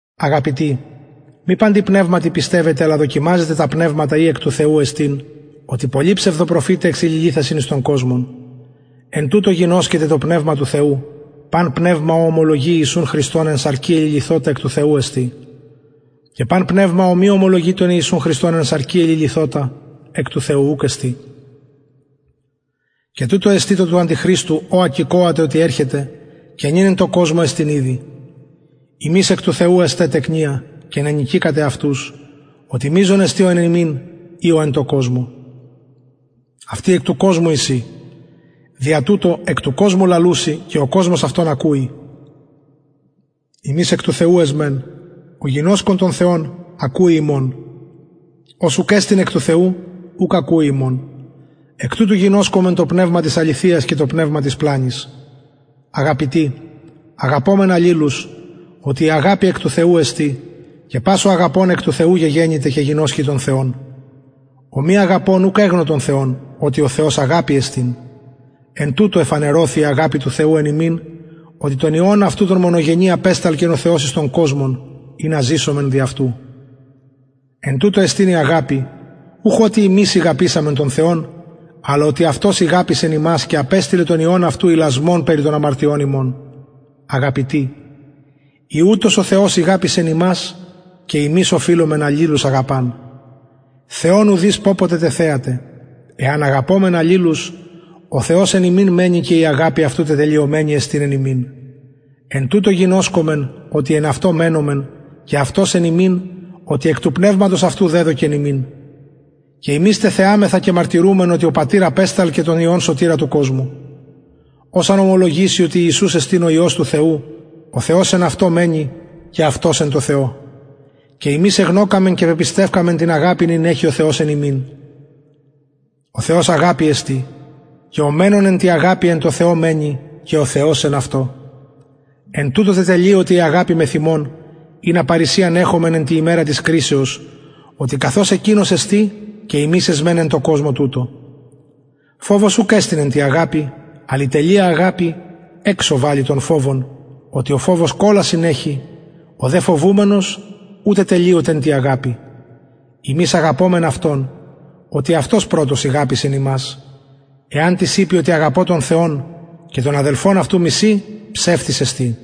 αγαπητοι μη παντι πνευματι πιστευετε αλλα δοκιμαζετε τα πνευματα ει εκ του θεου εστιν οτι πολλοι ψευδοπροφηται εξεληλυθασιν εις τον κοσμον εν τουτω γινωσκεται το πνευμα του θεου παν πνευμα ο ομολογει ιησουν χριστον εν σαρκι εληλυθοτα εκ του θεου εστιν και παν πνευμα ο μη ομολογει ιησουν χριστον εν σαρκι εληλυθοτα εκ του θεου ουκ εστιν και τουτο εστιν το του αντιχριστου ο ακηκοατε οτι ερχεται και νυν εν τω κοσμω εστιν ηδη υμεις εκ του θεου εστε τεκνια και νενικηκατε αυτους οτι μειζων εστιν ο εν υμιν η ο εν τω κοσμω αυτοι εκ του κοσμου εισιν δια τουτο εκ του κοσμου λαλουσιν και ο κοσμος αυτων ακουει ημεις εκ του θεου εσμεν ο γινωσκων τον θεον ακουει ημων ος ουκ εστιν εκ του θεου ουκ ακουει ημων εκ τουτου γινωσκομεν το πνευμα της αληθειας και το πνευμα της πλανης αγαπητοι αγαπωμεν αλληλους οτι η αγαπη εκ του θεου εστιν και πας ο αγαπων εκ του θεου γεγεννηται και γινωσκει τον θεον ο μη αγαπων ουκ εγνω τον θεον οτι ο θεος αγαπη εστιν εν τουτω εφανερωθη η αγαπη του θεου εν ημιν οτι τον υιον αυτου τον μονογενη απεσταλκεν ο θεος εις τον κοσμον ινα ζησωμεν δι αυτου εν τουτω εστιν η αγαπη ουχ οτι ημεις ηγαπησαμεν τον θεον αλλ οτι αυτος ηγαπησεν ημας και απεστειλεν τον υιον αυτου ιλασμον περι των αμαρτιων ημων αγαπητοι ει ουτως ο θεος ηγαπησεν ημας και ημεις οφειλομεν αλληλους αγαπαν θεον ουδεις πωποτε τεθεαται εαν αγαπωμεν αλληλους ο θεος εν ημιν μενει και η αγαπη αυτου τετελειωμενη εστιν εν ημιν εν τουτω γινωσκομεν οτι εν αυτω μενομεν και αυτος εν ημιν οτι εκ του πνευματος αυτου δεδωκεν ημιν και ημεις τεθεαμεθα και μαρτυρουμεν οτι ο πατηρ απεσταλκεν τον υιον σωτηρα του κοσμου ος αν ομολογηση οτι ιησους εστιν ο υιος του θεου ο θεος εν αυτω μενει και αυτος εν τω θεω και ημεις εγνωκαμεν και πεπιστευκαμεν την αγαπην ην εχει ο θεος εν ημιν ο θεος αγαπη εστιν και ο μενων εν τη αγαπη εν τω θεω μενει και ο θεος εν αυτω μενει εν τουτω τετελειωται η αγαπη μεθ ημων ινα παρρησιαν εχωμεν εν τη ημερα της κρισεως οτι καθως εκεινος εστιν και ημεις εσμεν εν τω κοσμω τουτω φοβος ουκ εστιν εν τη αγαπη αλλ η τελεια αγαπη εξω βαλλει τον φοβον οτι ο φοβος κολασιν εχει ο δε φοβουμενος ου τετελειωται εν τη αγαπη ημεις αγαπωμεν αυτον οτι αυτος πρωτος ηγαπησεν ημας εαν τις ειπη οτι αγαπω τον θεον και τον αδελφον αυτου μιση ψευστης εστιν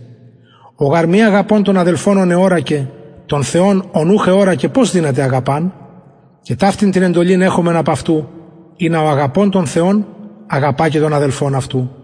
ο γαρ μη αγαπων τον αδελφον αυτου ον εωρακεν τον θεον ον ουχ εωρακεν πως δυναται αγαπαν και ταυτην την εντολην εχομεν απ αυτου ινα ο αγαπων τον θεον αγαπα και τον αδελφον αυτου